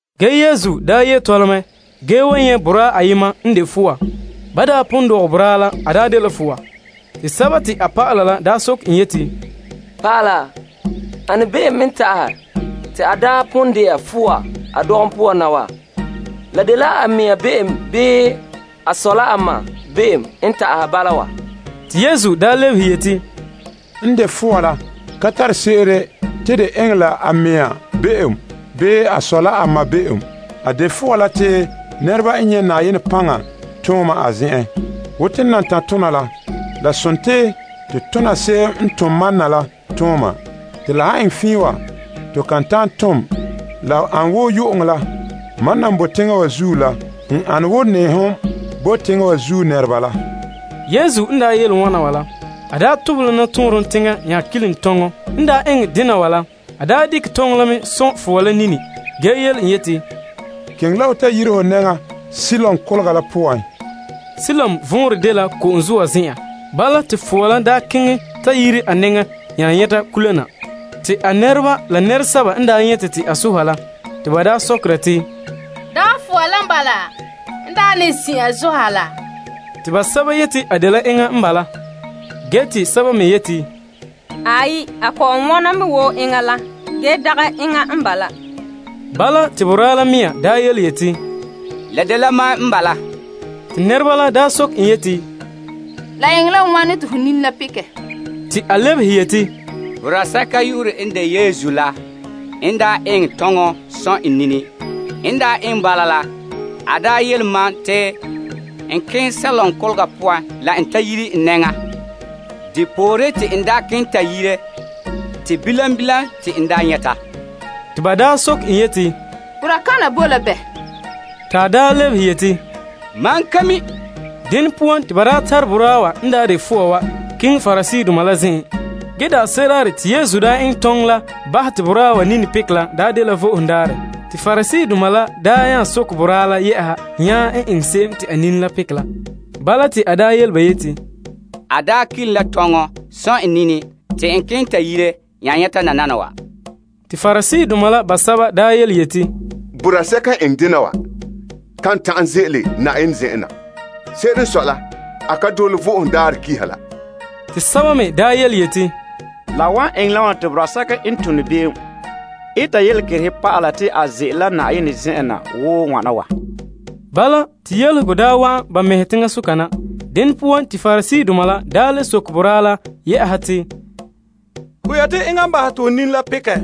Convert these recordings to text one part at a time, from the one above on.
Ge Yesu n ye' tɔla mɛ ge nyɛ' boraa ayema n de fɔa. Ban daa pon dɔgɛ boraa la, a dela fɔa. Te a dɔlɔba la soke en yeti, Naa, ane be'em n ta'ahɛ te a daa pon de'a fɔa a dɔgom poan na wa? La dela a mea be'em bii a sɔ la a ma be'em n bala wa? Te Yesu lebehe yeti, N de fɔa la ka tare se'ere te de enŋɛ la a mea be'em bii a sɔ la a ma be'em. A de fɔa la te nɛreba n nyɛ' Na'ayenɛ paŋa tooma a zen'en. Wo to nam tan' tona la, la sontii to tona se'em n tom mam na la tooma, te la nan nyɛte wa. Ge la han nyuulom tooma ka boe. Mam nam boe teŋa wa zuo la n ane wo nɛɛhom bo teŋa wa zuo nɛreba la. Yesu n daa yele wana wa la, a tobehɛ la nɔtɔɔnrom teŋa nya kilom tɔnŋɔ, dekɛ tɔnŋɔ la sɔn' fɔa la nini, ge yele en yeti, Keŋɛ la ho ta yire ho nɛŋa Siloam Kolega la poan. Siloam vɔnrɛ dela ko'om zoa zen'an. Bala, te fɔa la daa keŋɛ ta yire a nɛŋa nya nyɛta kula na. Te a nɛreba la nɛresɛba n nyɛte en te a soha la, ba sokera te, Dagɛ fɔa la n bala n daa ne zin'an soha laa? Te sɛba yeti a dela enŋa n bala. Ge, te sɛba me yeti, Aai, a kɔ'ɔn wona mɛ wo enŋa la, ge dagɛ enŋa n bala. Bala, te boraa la mea daa yeti, La dela mam n bala. Te nɛreba la daa soke en yeti, La eŋɛ la wane te ho nini la pekɛ? Te a lebehe yeti, Boraa sɛka yu'urɛ n de Yesu la n daa eŋɛ tɔnŋɔ sɔn' n nini. N daa eŋɛ bala la, a daa yele mam te n keŋɛ Siloam Kolega poan la n ta yire n nɛŋa. Depooren, te n daa keŋɛ ta yire te bilam bilam te n nyɛta. Te ba daa soke en yeti, Boraa kana boe la bɛ? Te a daa lebehe yeti, Mam ka mi'. Dene poan te ba tare boraa wa n daa de fɔa wa la keŋɛ Pariseedoma la zen'en. Te daanse'ere daarɛ te Yesu daa eŋɛ tɔnŋɔ la bahɛ te boraa la nini pekɛ la daa dela Vo'ohogo Daarɛ. Te Pariseedoma la nya soke boraa la le yɛ'ɛha en n eŋɛ se'em te a nini la pekɛ la. Bala, te a yele ba yeti, A daa kelom la tɔnŋɔ sɔn' n nini te n keŋɛ ta yire nya nyɛta nananawa. Te Pariseedoma la basɛba nya yeti, Boraa sɛka n eŋɛ dena wa kan ta'an ze'ele Na'ayenɛ zen'en na. Se'ere n sɔe la, a ka dole Vo'ohogo Daarɛ Pa'alegɔ la. Te sɛba me yeti, La wan eŋɛ la wane te boraa sɛka n tone be'em eta yelekerehe pa'ala te a ze'ele la Na'ayenɛ zen'en na wo wana wa? Bala, te yelehego daa wa'an ba mɛhe teŋasoka na. Dene poan te Pariseedoma la le soke boraa la le yɛ'ɛha yeti, Ho yeti enŋa n bahɛ te ho nini la pekɛ.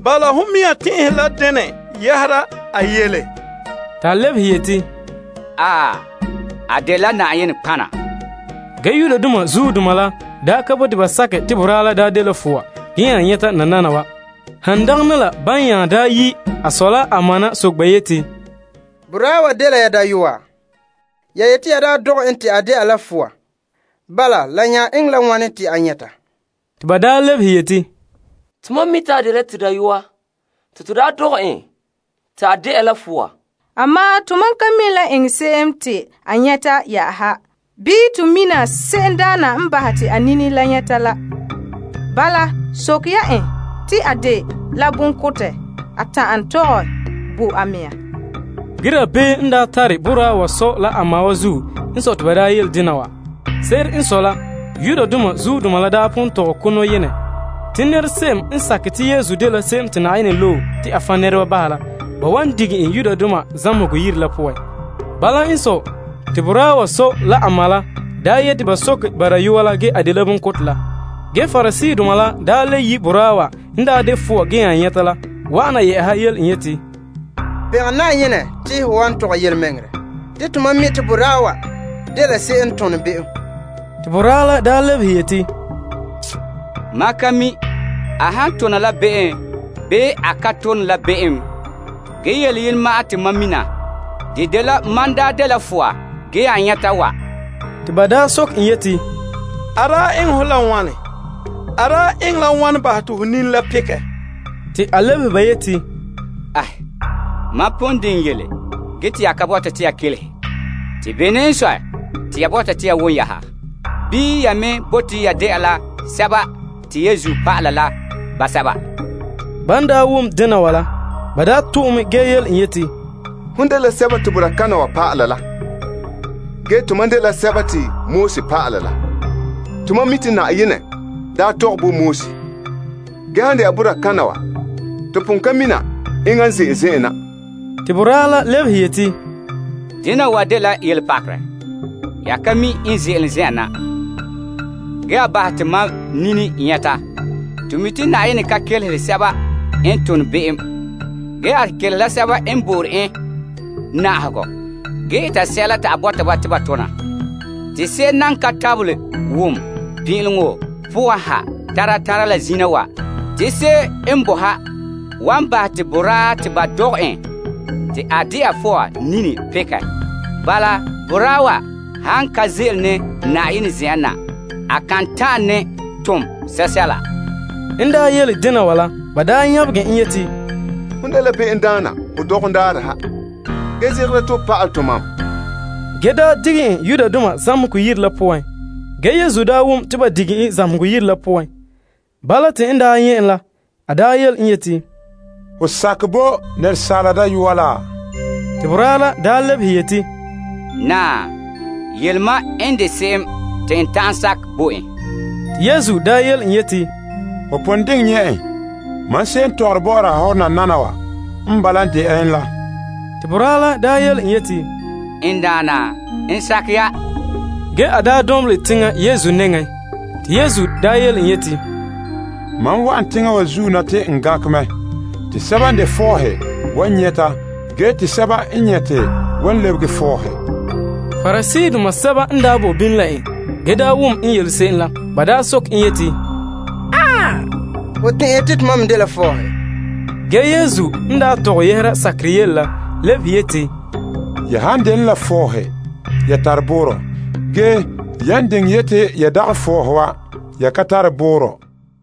Bala, hon mea tɛn'ɛhe la dena yɛhera a yele? Ta lebehe yeti, A dela nɔtɔgɔha. Ge Yudoma la daa ka bote ba sakɛ te boraa la daa dela fɔa ge nya nyɛta nananawa. Han dagana la ban nya daa yi' a sɔ la a ma na soke ba yeti, Boraa wa dela ya dayɔa? Ya yeti ya daa dɔgɛ en te a de'a la fɔa. Bala, la nya eŋɛ la wane te a nyɛta? Te ba lebehe yeti, Tomam mi' te a dela to dayɔa te to daa dɔgɛ en te a de'a fɔa. Ge, tomam ka mi' la eŋɛ se'em te a nyɛta yɛ'ɛha. Bii, to mina se'emdaana n bahɛ te a nini la nyɛta la. Bala, soke ya en te a dela bonkotɛ. A ta'an tɔgɛ bo a mea. Ge dabeem n tare boraa wa sɔ la a ma wa zuo n daa sɔe te ba daa dena wa. Se'ere n sɔe la, Yudoma daa pon tɔgɛ ko' nɔyenɛ. Te nɛrese'em n sakɛ te Yesu dela se'em te Yenɛ loe la, ba wan dige en bahɛ zamehegɔ yire la poan. Bala n sɔe, te boraa la sɔ la ma la daa yeti ba soke ba dayɔa la ge a dela bonkotɛ la. Ge Pariseedoma la nya le yi' boraa wa n daa de fɔa ge nya nyɛta wa yele en yeti, Pɔ' Na'ayenɛ te ho wan tɔgɛ yelemɛŋɛrɛ. Te tomam mi' te boraa wa dela se'em n tone be'em. Te boraa la lebehe yeti, Mam ka mi' a han tona la be'em bii a ka tone la be'em, ge yele yenɛ ma'an te mam mina. De dela mam daa dela fɔa ge nya nyɛta wa. Te ba sokɛ en yeti, A daa eŋɛ ho la wane? A daa eŋɛ la wane bahɛ te ho nini la pekɛ? Te a lebehe ba yeti, Mam pon diŋɛ yele ge te ya ka bɔta te ya kelehe. Te bene n sɔe te ya bɔta te ya wom yɛ'ɛha? Bii ya me bote ya de'a la Yesu dɔlɔba la basɛba? Ban daa wom dena wa la, ba to' en mɛ ge yele en yeti, Hon dela boraa kana wa dɔla, ge tomam dela Moses dɔlɔba. Tomam mi' te Na'ayenɛ daa tɔgɛ bo Moses. Ge han de'a boraa kana, to pon ka mina enŋa n ze'ele zen'an na. Te boraa la lebehe yeti, Dena wa dela yelepakerɛ. Ya ka mi' n ze'ele zen'an na. Ge, a bahɛ te mam nini nyɛta. To mi' te Na'ayenɛ ka kelehere sɛba n tone be'em. Ge, a kelehere la sɛba n bo'ore en na'ahegɔ ge eta sɛla te a bɔta ba te ba tona. Te se'em nan ka tabelɛ wom pin'ileŋɔ poan ha tara tara la zina wa te se'em bo ha wan bahɛ te boraa te ba dɔgɛ en te a de'a fɔa nini pekɛ. Bala, boraa wa han ka ze'ele ne Na'ayenɛ zen'en na, a kan ta'an tom sɛla. N yele dena wa la, ba daa nyabegɛ en yeti, Hon tare be'em ho dɔgom daarɛ yɛ'ɛha, ge zegɛra te ho pa'alɛ tomam. Ge te ba daa dige en zamehegɔ yire la poan. Ge Yesu daa wom te ba dige en zamehegɔ yire la poan. Bala, te en ta nyɛ' en yele en yeti, Ho sakɛ bo Asaala Dayɔa la? Te boraa la lebehe yeti, Naa, yele mam n de se'em te n ta'an sakɛ bo en. Te Yesu yele en yeti, Ho pon diŋɛ nyɛ' en. Mam se'em n tɔgɔre bɔ'ɔra hɔ nananawa, n bala de'a en la. Te boraa la yeti, N Daana, n sakɛ ya. Ge a daa dɔnbelɛ teŋa Yesu nɛŋa. Te Yesu yele en yeti, Mam wa'an teŋa wa zuo na te n gankɛ mɛ. Te sɛba n de fɔɔhe wan nyɛta ge te sɛba n nyɛte wan lebege fɔɔhe. Pariseedoma sɛba n daa boe bini la en ge wom n yele se'em la, soke en yeti, Ho tɛn'ɛhe te tomam me dela fɔɔhe? Ge, te Yesu n tɔgɛ yɛhera sakera yele ge lebehe yeti, Ya han de ne la fɔɔhe, ya tare boorɔ. Ge, yan diŋɛ yeti ya dagɛ fɔɔhe wa, ya ka tare boorɔ.